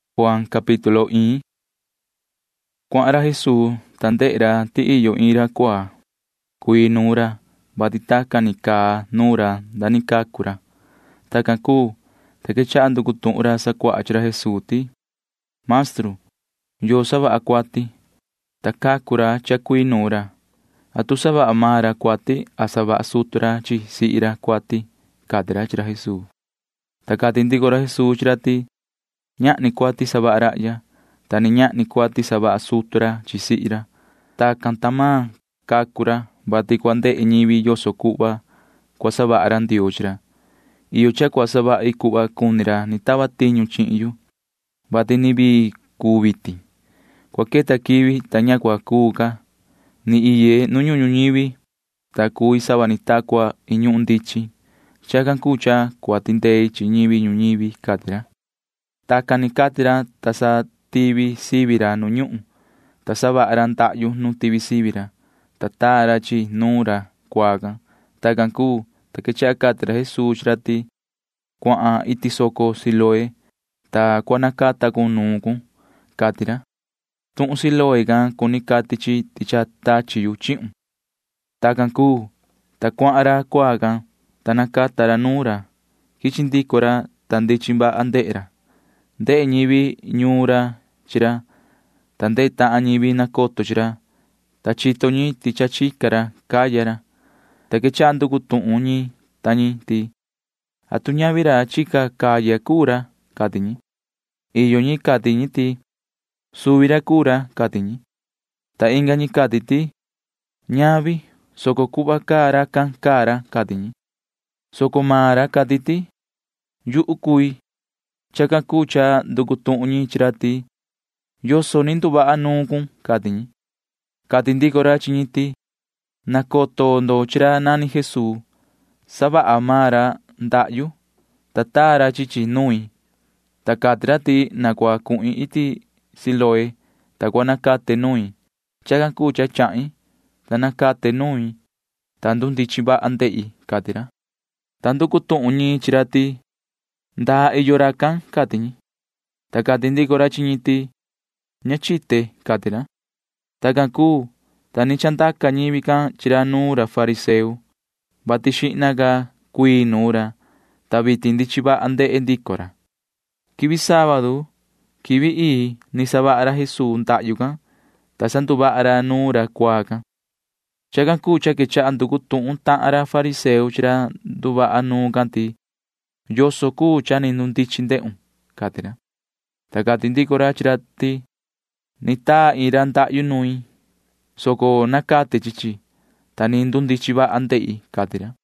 Cuahan ra Jesuu, ta ndehe ra ti iyo iin ra cuaa. Cuii nuun ra, vati tacan ni caa nuun ra nda ni cacu ra. Tacan cuu, ta quechaha nducu tuhun ra sacuaha chi ra Jesuu ti: ―Maestru, ¿yoo savaha cuati, ta cacu ra cha cuii nuun ra? ¿Atu savaha maan ra cuati a savaha sutu ra chi sihi ra cuati? ―cati ra chi ra Jesuu. Ta cati ndico ra Jesuu chi ra ti: ―Ñahni cuati savaha rahya, ta ni ñahni cuati savaha sutu ra chi sihi ra. Tacan tahan ni cacu maan ra, vati cua ndehe ñivi yoso cuhva cua savaha ra Ndioo chi ra. Iyo cha cua savahi cuhva cuni ra ni tava tiñu chihin yu, vati ni vii cuu vitin. Cua queta quivi, ta ña cua cuu ca. Ni iye nu ñuhun ñuñivi, ta cui sava ni ta cua iin ñuhun ndichin. [Chacan cuu cha cua tindei chi ñivi ñuñivi] ―cati ra. Tacan ni cati ra, ta sa tivi sivi ra nu ñuhun, ta savaha ra ndahyu nu tivi sivi ra, ta taa ra chi chi nuun ra cuaa can. Tacan cuu, ta quechaha cati ra Jesuu chi ra ti: ―Cuahan iti soco Siloé, ta cua nacata cun nuun cun ―cati ra. Tuhun Siloé can cuni cati ti cha tachi yu chihun. Tacan cuu, ta cuahan ra cuaa can, ta nacata ra nuun ra. Quichi ndico ra, ta ndichin vaha ndehe ra. Ndehe ñivi ñuun ra chi ra, ta ndehe tahan ñivi nacoto chi ra, ta chito ñi ti cha chica ra caya ra, ta quechaha nducu tuhun ñi ta ñi ti: ―¿Atu ñavi ra chica caya cuu ra? ―cati ñi. Iyo ñi cati ñi ti: ―Suvi ra cuu ra ―cati ñi. Ta inga ñi cati ti: ―Ñavi, soco cuhva caa racan caa ra ―cati ñi, soco maan ra cati ti: ―Yuhu cui. Chacan cuu cha nducu tuhun ñi chi ra ti: ―¿Yoso ni nduvaha nuun cun? ―cati ñi. Cati ndico ra chi ñi ti: ―Nacoto ndo chi ra nani Jesuu. Savaha maan ra ndahyu, ta taa ra chi chi nuin, ta cati ra ti na cua cuhin iti Siloé, ta cua nacate nuin. Chacan cuu cha chahin, ta nacate nuin, ta ndundichin vaha ndehi ―cati ra. Ta nducu tuhun ñi chi ra ti: ―¿Ndaa iyo racan? ―cati ñi. Ta cati ndico ra chi ñi ti: ―Ña chite ―cati ra. Tacan cuu, ta ni chandaca ñivi can chi ra nuun ra fariseo, vati xihna ca cuii nuun ra, ta vitin ndichin vaha ndehe ndico ra. Quivi sábadu quivi ii ni savaha ra Jesuu ndahyu can, ta sanduvaha ra nuun ra cuaa can. Chacan cuu cha quechaha nducu tuhun tahan ra fariseo chi ra nduvaha nuun can ti: ―¿Yoso cuu cha ni ndundichin ndehun? ―cati ra. Ta cati ndico ra chi ra ti: ―Ni taa iin ra ndahyu nuin, soco nacate chi chi, ta ni ndundichin vaha ndehi ―cati ra.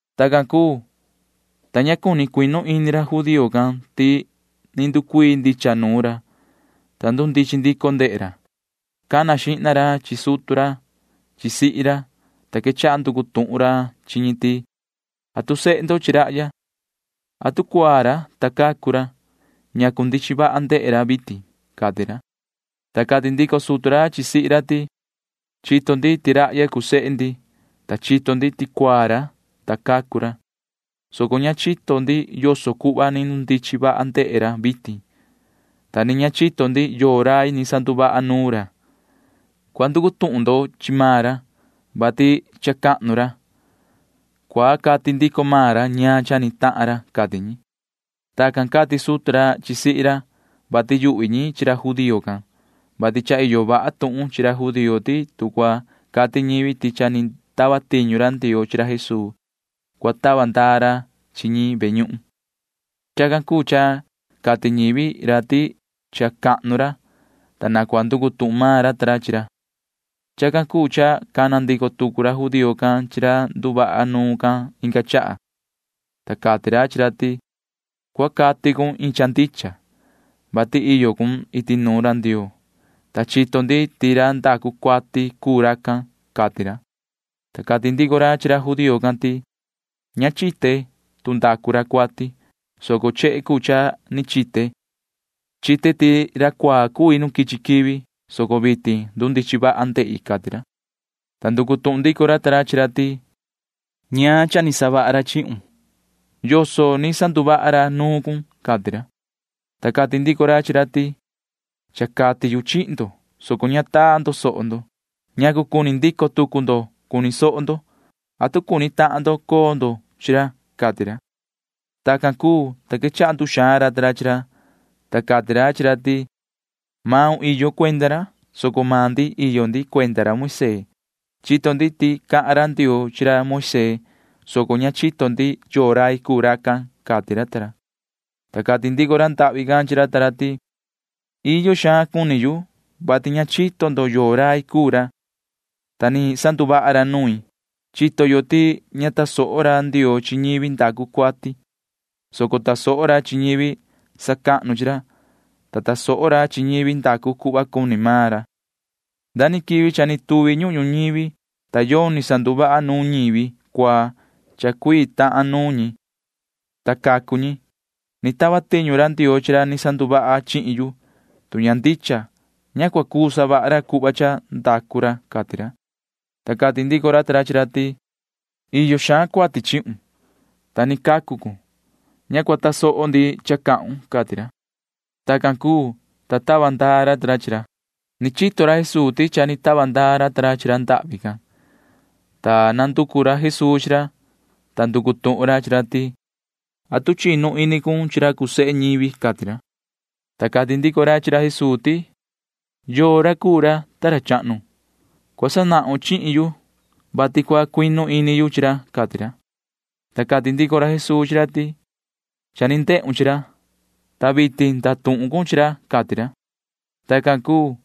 Tacan cuu, ta ña cuni cuinu ini ra judío can ti ni nducuii ndicha nuun ra, ta ndundichin ndico ndehe ra. Cana xihna ra chi sutu ra chi sihi ra, ta quechaha nducu tuhun ra chi ñi ti: ―¿Atu sehe ndo chi rahya? ¿Atu cuaa ra, ta cacu ra? ¿Ñacu ndichin vaha ndehe ra vitin? ―cati ra. Ta cati ndico sutu ra chi sihi ra ti: ―Chito ndi ti rahya cuu sehe ndi, ta chito ndi ti cuaa ra, ta cacu ra, soco ña chito ndi yoso cuhva ni ndundichin vaha ndehe ra vitin, ta ni ña chito ndi yoo rai ni sanduvaha nuun ra. Cua nducu tuhun ndo chi maan ra, vati cha cahnu ra. Cua cati ndico maan ra ñaan cha ni tahan ra ―cati ñi. Tacan cati sutu ra chi sihi ra, vati yuhvi ñi chi ra judío can, vati cha iyo vaha tuhun chi ra judío ti tu cua cati ñivi ti cha ni tava tiñu ra Ndioo chi ra Jesuu, cua tava ndaa ra chi ñi ve ñuhun. Chacan cuu cha cati ñivi ra ti cha cahnu ra, ta na cua nducu tuhun maan ra ta ra chi ra. Chacan cuu cha cana ndico tucu ra judío can chi ra nduvaha nuun can inga chaha, ta cati ra chi ra ti: ―Cua cati cun iin cha ndicha, vati iyo cun iti nuun ra Ndioo, ta chito ndi ti ra ndacu cuati cuu racan ―cati ra. Ta cati ndico ra chi ra judío can ti: ―Ña chite tu ndacu ra cuati, soco chehe cuu cha ni chite. Chite ti ra cuaa cui nu quichi quivi, soco vitin ndichin vaha ndehi ―cati ra. Ta nducu tuhun ndico ra ta ra chi ra ti: ―¿Ñaan cha ni savaha ra chihun? ¿Yoso ni sanduvaha ra nuun cun? ―cati ra. Ta cati ndico ra chi ra ti: ―Cha cati yu chihin ndo, soco ña tasoho ndo. ¿Ñacu cuni ndico tucu ndo cuni soho ndo? ¿Atu cuni tahan ndo coo ndo chi ra? ―cati ra. Tacan cuu, ta quechaha nduxaan ra ta ra chi ra, ta cati ra chi ra ti: ―Iyo maun cuenda ra, soco iyo maan ndi cuenda ra Moisee. Chito ndi ti cahan ra Ndioo chi ra Moisee, soco ña chito ndi yoo rai cuu racan ―cati ra ta ra. Ta cati ndico ra ndahvi can chi ra ta ra ti: ―Iyo xaan cuni yu, vati ña chito ndo yoo rai cuu ra, ta ni sanduvaha ra nuin. Chito yo ti ña tasoho ra Ndioo chi ñivi ndacu cuati, soco tasoho ra chi ñivi sacahnu chi ra, ta tasoho ra chi ñivi ndacu cuhva cuni maan ra. Nda quivi cha ni tuvi ñuhun ñuñivi, ta yoni sanduvaha nuun ñivi cuaa cha cuii tahan nuun ñi, ta cacu ñi. Ni tava tiñu ra Ndioo chi ra ni sanduvaha chihin yu. Tu ña ndicha, ña cua cuu savaha ra cuhva cha ndacu ra ―cati ra. Ta cati ndico ra ta ra chi ra ti: ―Iyo xaan cuati chihun, ta ni cacu cun. Ña cua tasoho ndi cha cahun ―cati ra. Tacan cuu, ta tava ndaa ra ta ra chi ra. Ni chito ra Jesuu ti cha ni tava ndaa ra ta ra chi ra ndahvi can, ta nanducu ra Jesuu chi ra, ta nducu tuhun ra chi ra ti: ―¿Atu chinu ini cun chi ra cuu sehe ñivi? ―cati ra. Ta cati ndico ra chi ra Jesuu ti: ―¿Yoo ra cuu ra, ta ra chahnu? Cua sanahun chihin yu, vati cua cuinu ini yu chi ra ―cati ra. Ta cati ndico ra Jesuu chi ra ti: ―Cha ni ndehun chi ra, ta vitin ndatuhun cun chi ra ―cati ra. Tacan cuu,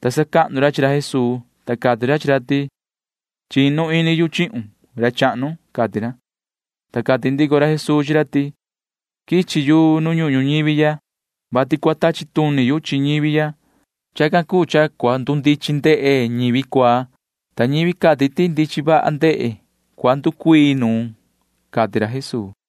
ta sacahnu ra chi ra Jesuu, ta cati ra chi ra ti: ―Chinu ini yu chihun, ra chahnu ―cati ra. Ta cati ndico ra Jesuu chi ra ti: ―Quichi yu nu ñuhun ñuñivi ya, vati cua tachi tuni yu chi ñivi ya. Chacan cuu cha cua ndundichin ndehe ñivi cuaa, ta ñivi cati ti ndichin vaha ndehe cua nducuii nuun ―cati ra Jesuu.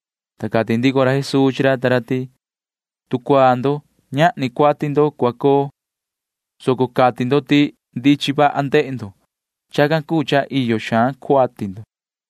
Ta cati ndico ra Jesuu chi ra ta ra ti: ―Tu cuaa nuun ndo, ñahni cuati ndo cua coo, soco cati ndo ti ndichin vaha ndehe ndo. Chacan cuu cha iyo xaan cuati ndo.